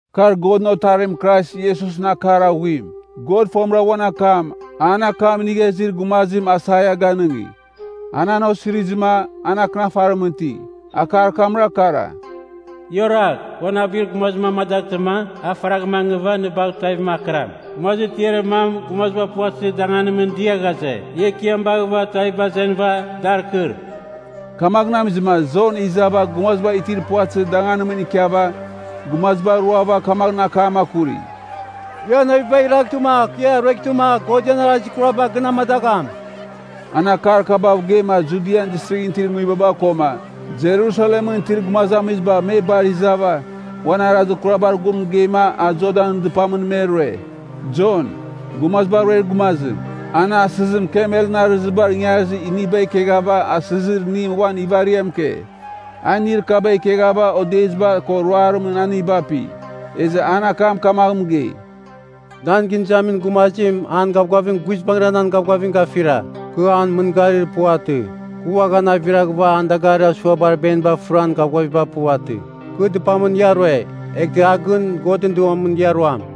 Kar Godɨn Otarim Krais Iesusɨn akar aghuim. God fomɨra uan akam, an akam inigha izir gumazim Aisaia ganɨngi. An an osirizɨma, an akɨnafarimɨn iti. Akar kamra kara. “Ia oragh! Kɨ uan abuir gumazim amadaghtɨma, a faragh mangɨva nɨ bagh tuavim akɨram.” “Gumazir tiarir mam gumaziba puvatɨzir danganimɨn dia ghaze, ‘Ia Ekiam baghɨva tuaviba azenɨva, dar kɨr.’” Kamaghɨn amizɨma Jon izava gumaziba itir puvatɨzir danganimɨn ikiava gumaziba ruava kamaghɨn akam akuri, “Ia navibagh iraghtɨma kɨ ia rueghtɨma God ian arazir kuraba gɨn amadagham.” An akar kabav geima Judian Distrighɨn itir nguibaba koma Jerusalemɨn itir gumazamiziba me bar izava uan arazir kurabar gun mɨgeima a Jordanɨn dɨpamɨn me rue. Jon, Gumaziba Ruer Gumazim, ana asɨzim kamelɨn arɨzibar ingarizir iniba ikeghava asɨzir inim uan ivariam ike. A inir kaba ikeghava odeziba ko ruarimɨn haniba api. Ezɨ an akam kamaghɨn mɨgei, “Nan gɨn izamin gumazim an gavgavim guizbangɨra nan gavgavim gafira. Kɨ an mɨngarir puvatɨ. Kɨ uaghan aviraghɨva an dagarir asuabar beniba fɨran gavgaviba puvatɨ. Kɨ dɨpamɨn ia rue, eghtɨ a gɨn Godɨn Duamɨn ia ruam.”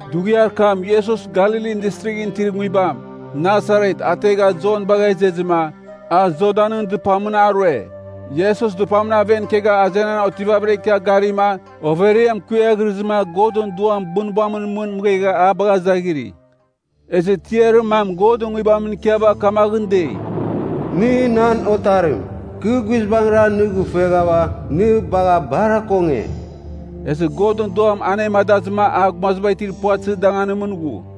Dughiar kam Iesus Galilin Distrighɨn itir nguibam, Nasaret, ateghava Jon bagha izezɨma, a Jordanɨn dɨpamɨn a rue. Iesus dɨpamɨn aven ikegha azenan otivavɨra ikia garima overiam kuiaghirɨzɨma Godɨn Duam bunbamɨn mɨn mɨghegha a bagha izaghiri. Ezɨ tiarir mam Godɨn Nguibamɨn ikiava kamaghɨn dei, “Nɨ nan Otarim. Kɨ guizbangɨra nɨ gɨfueghava nɨ bagha bar akonge.” Ezɨ Godɨn Duam anemadazɨma a gumaziba itir puvatɨzir danganimɨn ghu.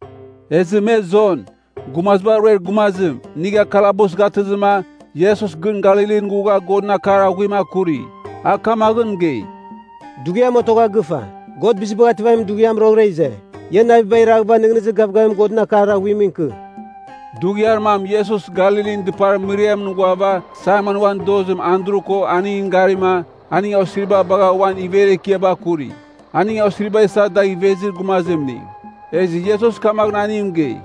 Ezɨ me Jon, Gumaziba Ruer Gumazim, inigha kalabus gatɨzɨma, Iesus gɨn Galilin ghugha Godɨn akar aghuim akuri. A kamaghɨn mɨgei, “Dughiam otogha gɨfa. God Bizibagh Ativamin Dughiam roghɨra ize. Ia navibagh iraghɨva nɨghnɨzir gavgavim Godɨn akar aghuimɨn ikɨ.” Dughiar mam Iesus Galilin dɨpar mɨriamɨn ghuava Saimon uan dozim Andru ko aningɨn garima, aning osiriba baghava uan iver ekiaba kuri. Aning osiriba isa dagh ivezir gumazimning. Ezɨ Iesus kamaghɨn aning mɨgei,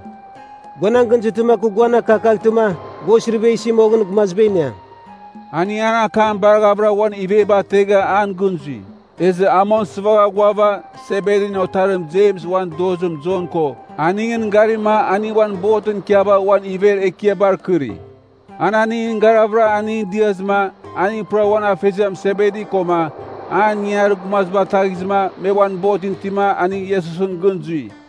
“Gua nan gɨn izɨtɨma kɨ guan akakaghtɨma, gua osiriba isi moghɨn gumaziba iniam.” Aning an akam baraghavɨra uan iveba ategha an gɨn zui. Ezɨ a mong sɨvagha ghuava, Sebedin otarim Jems uan dozim Jon ko aningɨn garima aning uan botɨn ikiava uan iver ekiabar kɨri. An aningɨn garavɨra aningɨn diazɨma, aning pura uan afeziam Sebedi koma an ingangarir gumaziba ataghizɨma me uan botɨn itima aning Iesusɨn gɨn zui.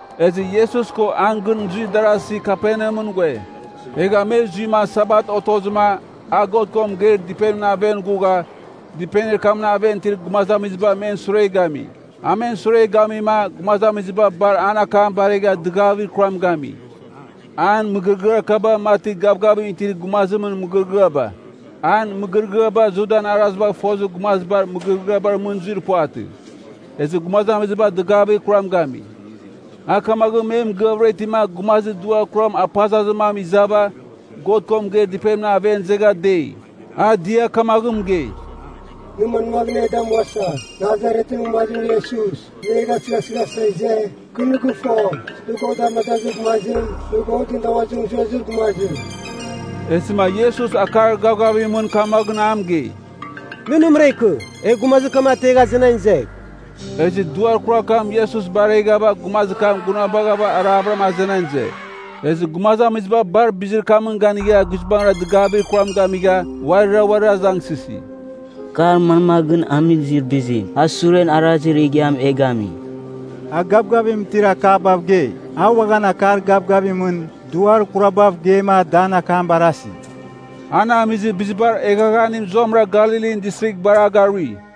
Ezɨ Iesus ko an gɨn zuir darasi Kaperneamɨn ghue. Egha me zuima Sabat otozɨma, a God ko mɨgeir dɨpenimɨn aven ghugha, dɨpenir kamɨn aven itir gumazamiziba men sure gami. A men sure gamima gumazamiziba bar an akam baregha dɨgavir kuram gami. An mɨgɨrɨgɨar kaba mati gavgavim itir gumazimɨn mɨgɨrɨgɨaba. An mɨgɨrɨgɨaba Judan arazibagh fozir gumazibar mɨgɨrɨgɨabar mɨn zuir puvatɨ. Ezɨ gumazamiziba dɨgavir kuram gami. A kamaghɨn me mɨgɨavɨra itima gumazir duar kuram apazazir mam izava God ko mɨgeir dɨpenimɨn aven izegha dei. A dia kamaghɨn mɨgei, “Nɨ manmaghɨn e damuasa, Nasaretɨn gumazim Iesus? Nɨ e gasɨghasɨghasa ize? Kɨ nɨ gɨfo, nɨ God amadazir gumazim, nɨ Godɨn damazimɨn zuezir gumazim.” Ezɨma Iesus akar gavgavimɨn kamaghɨn a mɨgei, “Nɨ nɨmɨra ikɨ, egh gumazir kam ategh azenan izegh.” Ezɨ duar kurar kam Iesus bareghava gumazir kam gunabagha aravɨram azenan ize. Ezɨ gumazamiziba bar bizir kamɨn ganigha guizbangɨra dɨgavir kuram gamigha uarira uarir azangsɨsi, “Kar manmaghɨn amizir bizim? A suren arazir igiam e gami. A gavgavim itir akabav gei. A uaghan akar gavgavimɨn duar kurabav geima da an akam barasi.” An amizir bizibar eghaghanim zuamɨra Galilin Distrigh bar a garui.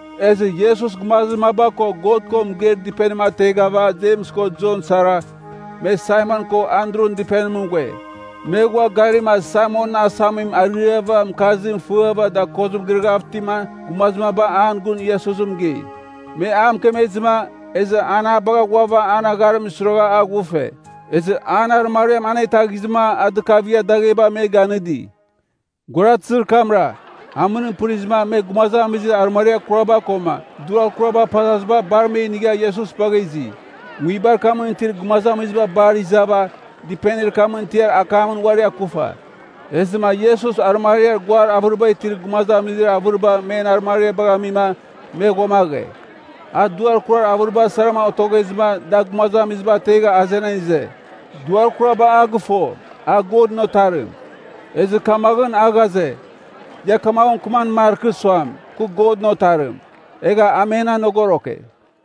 Ezɨ Iesus gumazir maba ko God ko mɨgeir dɨpenim ateghava Jems ko Jon sara, me Saimon ko Andrun dɨpenimɨn ghue. Me ghua garima Saimonɨn asamim ariava mɨkarzim fɨava dakozim girɨghav itima gumazir maba an gun Iesus mɨgei. Me a mɨkemezɨma, ezɨ an a bagha ghuava an agharimɨn suiragha a ghufe. Ezɨ an arɨmariam anetaghizɨma a dɨkavigha dagheba me ganɨdi. Guaratɨzir kamra, amɨnim pɨrizɨma me gumazamizir arɨmariar kuraba koma duar kuraba apazaziba bar me inigha Iesus bagha izi. Nguibar kamɨn itir gumazamiziba bar izava dɨpenir kamɨn tiar akamɨn uari akufa. Ezɨma Iesus arɨmariar guar avɨriba itir gumazamizir avɨriba men arɨmariabagh amima me ghuamaghe. A duar kurar avɨriba sarama otoghezɨma da gumazamiziba ategha azenan ize. Duar kuraba a gɨfo, a Godɨn Otarim. Ezɨ kamaghɨn a ghaze, ia kamaghɨn mɨkɨman markɨ suam, Kɨ Godɨn Otarim. Egha a men anogoroke.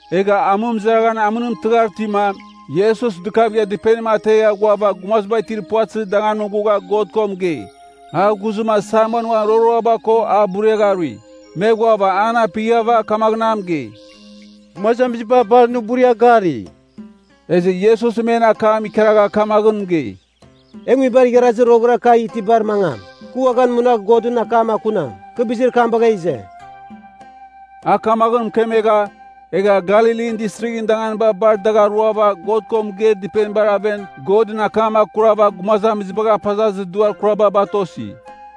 Egha amɨmɨzaraghan amɨnim tɨghar itima, Iesus dɨkavigha dɨpenim ategha ghuava gumaziba itir puvatɨzir danganimɨn ghugha God ko mɨgei. A ghuzɨma Saimon uan roroaba ko a buriagharui. Me ghuava an apighava kamaghɨn a mɨgei, “Gumazamiziba bar nɨ buria gari.” Ezɨ Iesus men akam ikaragha kamaghɨn mɨgei, “E nguibar igharazir roghɨra kagh itibar mangam. Kɨ uaghan munagh Godɨn akam akunam. Kɨ bizir kam bagha ize.” A kamaghɨn mɨkemegha, egha Galilin Distrighɨn danganiba bar dagh aruava God ko mɨgeir dɨpenibar aven Godɨn akam akurava gumazamizibagh apazazir duar kuraba batosi.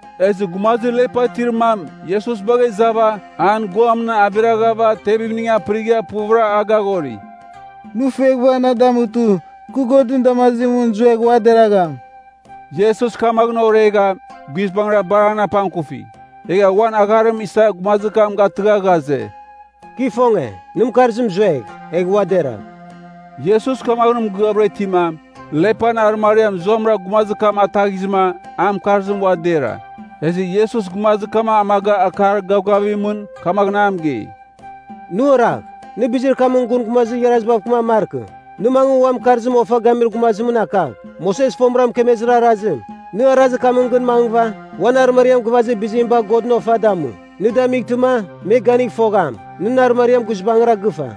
Ezɨ gumazir lepa itir mam Iesus bagha izava, an guamɨn aviraghava tevimning apɨrigha puvɨra a gaghori, “Nɨ fueghɨva na damutɨ, kɨ Godɨn damazimɨn zuegh ua deragham.” Iesus kamaghɨn oregha, guizbangɨra bar an apangkufi. Egha uan agharim isa gumazir kam gatɨgha ghaze, “Kɨ ifonge. Nɨn mɨkarzim zuegh, egh ua deragh.” Iesus kamaghɨn mɨgɨavɨra itima, lepan arɨmariam zuamɨra gumazir kam ataghizɨma an mɨkarzim ua dera. Ezɨ Iesus gumazir kam amaga akar gavgavimɨn kamaghɨn a mɨgei, “Nɨ oragh. Nɨ bizir kamɨn gun gumazir igharazitam mɨkɨman markɨ. Nɨ mangɨ uan mɨkarzim ofa gamir gumazimɨn akagh. Moses fomɨra mɨkemezir arazim, nɨ arazir kamɨn gɨn mangɨva, uan arɨmariam gɨvazir bizim bagh Godɨn ofa damu. Nɨ damightɨma, me ganigh fogham, nɨn arɨmariam guizbangɨra gɨfa.”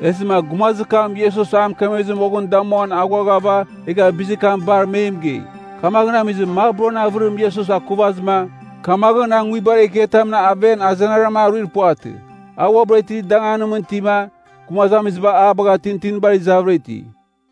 Ezɨma gumazir kam Iesus a mɨkemezɨ moghɨn damuan aghuaghava egha bizir kam bar me mɨgei. Kamaghɨn amizɨma maburan avɨrim Iesus akuvazɨma, kamaghɨn a nguibar ekiatamɨn aven azenaram aruir puvatɨ. A uabɨra itir danganimɨn itima, gumazamiziba a bagha tintinibar izavɨra iti.